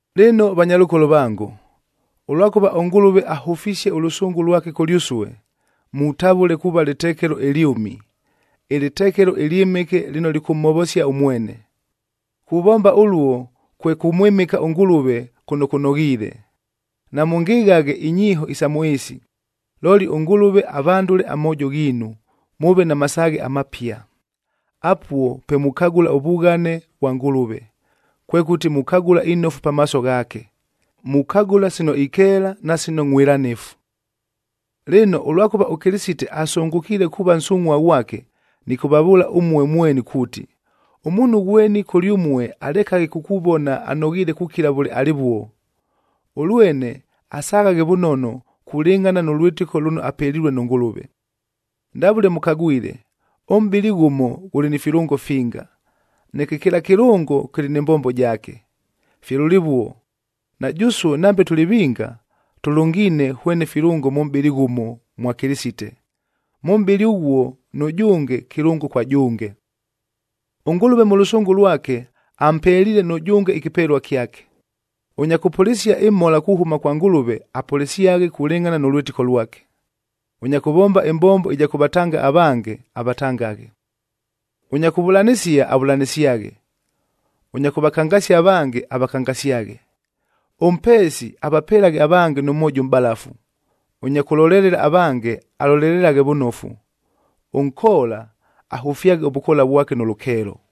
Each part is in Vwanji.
Lɨno vanyalʉkolo vango, ʉlwakʉva ʉNgʉlʉve ahʉfisie ʉlʉsʉngʉ lwake kʉlyʉsue, mutavʉle kuuva lɨtekelo ɨlyʉmi,a ɨlɨtekelo ɨlyɨmɨke lɨno lɨkʉmhovosia ʉmwene. Kuvomba ʉluo kwe kʉmwɨmɨka ʉNgʉlʉve kʉno kʉnoghiile. Namʉngɨghaghe inyiiho isa mʉ ɨɨsi, looli ʉNgʉlʉve avandʉle amoojo ghiinu, mʉʉve na masaaghe amapia. Apuo pe mukagʉla ʉvughane vwa Ngʉlʉve, kwekʉti mukagʉla inofu pamaaso ghaake, mukagʉla sino ikeela na sino ngʼhwɨlanifu. Lɨno, ʉlwakʉva ʉKɨlɨsite asʉngʉkiile kuuva nsungʼhua ghwake, nɨkʉvavʉʉla ʉmue mweni kuuti, ʉmuunhu ghweni kʉlyʉmue alekaghe kukuvona anoghiile kukila vʉle alɨvuo, ʉlwene asaghaghe vʉnono kulɨngʼhana nʉ lwɨtɨko lʉno apelilue nʉ Ngʉlʉve. Ndavʉle mʉkagwile, ʉmʼbɨlɨ ghʉmo ghʉlɨ ni filʉngo finga, neke kɨla kɨlʉngo kɨlɨ nɨ mbombo jaake. Fye lʉlɨvuo, na jʉsue nambe tʉlɨ vinga, tʉlʉngiine hwene filʉngo mʉ mʼbɨlɨ ghʉmo mwa Kɨlɨsite. Mʉ mʼbɨlɨ ʉghuo nʉjʉnge kɨlʉngo kwa jʉnge. ɄNgʉlʉve mʉ lʉsʉngʉ lwake ampeliile nʉjʉnge ɨkɨpelua kyake. Ʉnya kʉpʉlɨsia ɨmhola kuhʉma kwa Ngʉlʉve, apʉlɨsyaghe kulɨngʼhana nʉ lwɨtɨko lwake. Ʉnya kʉvomba ɨmbombo ɨja kʉvatanga avange, avatangaghe; ʉnya kʉvʉlanɨsia, avʉlanɨsyaghe; ʉnya kʉvakangasia avange, avakangasyaghe; ʉmpeesi, avapelaghe avange nʉ mwojo ʉmʼbalafu; ʉnya kʉlolelela avange, alolelelaghe vʉnofu; ʉnkoola, ahʉfyaghe ʉvʉkoola vwake nʉ lʉkeelo.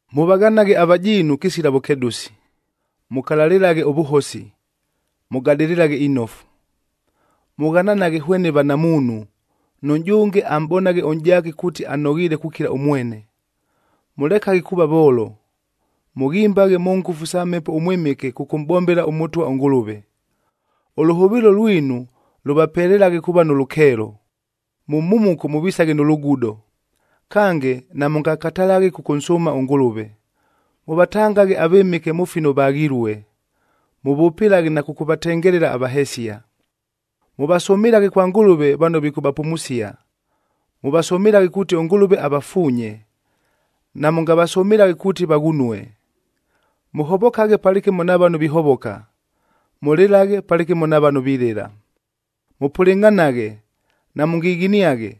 Mʉvaghanaghe avajiinu kɨsila vʉkedʉsi, mʉkalalɨlaghe ʉvʉhosi, mʉgadɨlɨlaghe inofu. Mʉghananaghe hwene vanamuunhu, nʉjʉnge amʼbonaghe ʉnʼjaake kuuti anoghiile kukila ʉmwene. Mʉlekaghe kuuva voolo, mʉghimbaghe mʉ ngʉfu sa Mhepo ʉMwɨmɨke kʉkʉmʼbombela ʉMʉtwa ʉNgʉlʉve. Ʉlʉhʉvɨɨlo lwinu lʉvapelelaghe kuuva nʉ lʉkeelo, mʉ mhumuko mʉvisaghe nʉ lugudo, kange namʉngakatalaghe kʉkʉnsʉʉma ʉNgʉlʉve. Mʉvatangaghe avɨmɨke mʉ fino vaghilue, mʉvʉpɨlaghe na kʉkʉvatengelela avahesia. Mʉvasʉmɨlaghe kwa Ngʉlʉve vano vikʉvapumusia. Mʉvasʉmɨlaghe kuuti ʉNgʉlʉve avafuunye, namʉngavasʉmɨlaghe kuuti vaghunue. Mʉhovokaghe palɨkɨmo na vano vihovoka, mʉlɨlaghe palɨkɨmo na vano vilɨla. Mʉpʉlɨngʼhanaghe, namʉngighiniaghe,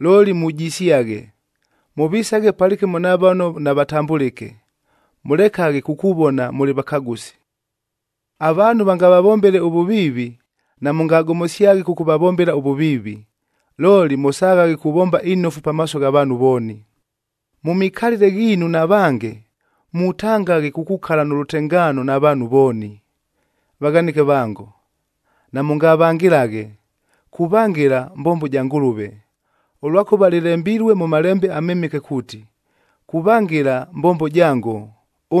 looli mujisyaghe. Mʉvisaghe palɨkɨmo na vano navatambʉlɨke, mʉlekaghe kukuvona mʉlɨ vakagʉsi. Avaanhu vangavavombele ʉvʉviivi, namʉngagomosyaghe kʉkʉvavombela ʉvʉviivi, looli mʉsaghaghe kuvomba inofu pamaaso gha vaanhu vooni. Mʉ mikalɨle ghiinu na vange, mutangaghe kukukala nʉ lʉtengaano na vaanhu vooni. Vaghanɨke vango, namʉngavangɨlaghe. Kuvangɨla mbombo ja Ngʉlʉve, ʉlwakʉva lɨlembilue mʉ Malembe aMɨmɨke kuuti, “Kuvangɨla mbombo jango,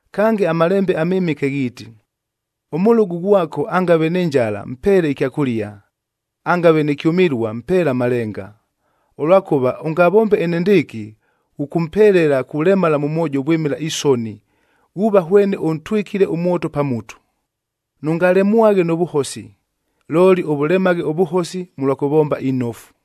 Kange, aMalembe aMɨmɨke ghiiti, “Ʉmʉlʉgʉ ghwako angave nɨ njala mpeele ɨkyakʉlia, angave nɨ kyʉmɨlua mpeele amalenga. Ʉlwakʉva ʉngavombe enendɨɨkɨ, ghʉkʉmpelela kulemala mʉ mwojo vwɨmɨla isoni, ghuuva hwene ʉntwɨkile ʉmwoto pa mutu.” Nʉngalemwaghe nʉ vʉhosi, looli ʉvʉlemaghe ʉvʉhosi mʉlwa kʉvomba inofu.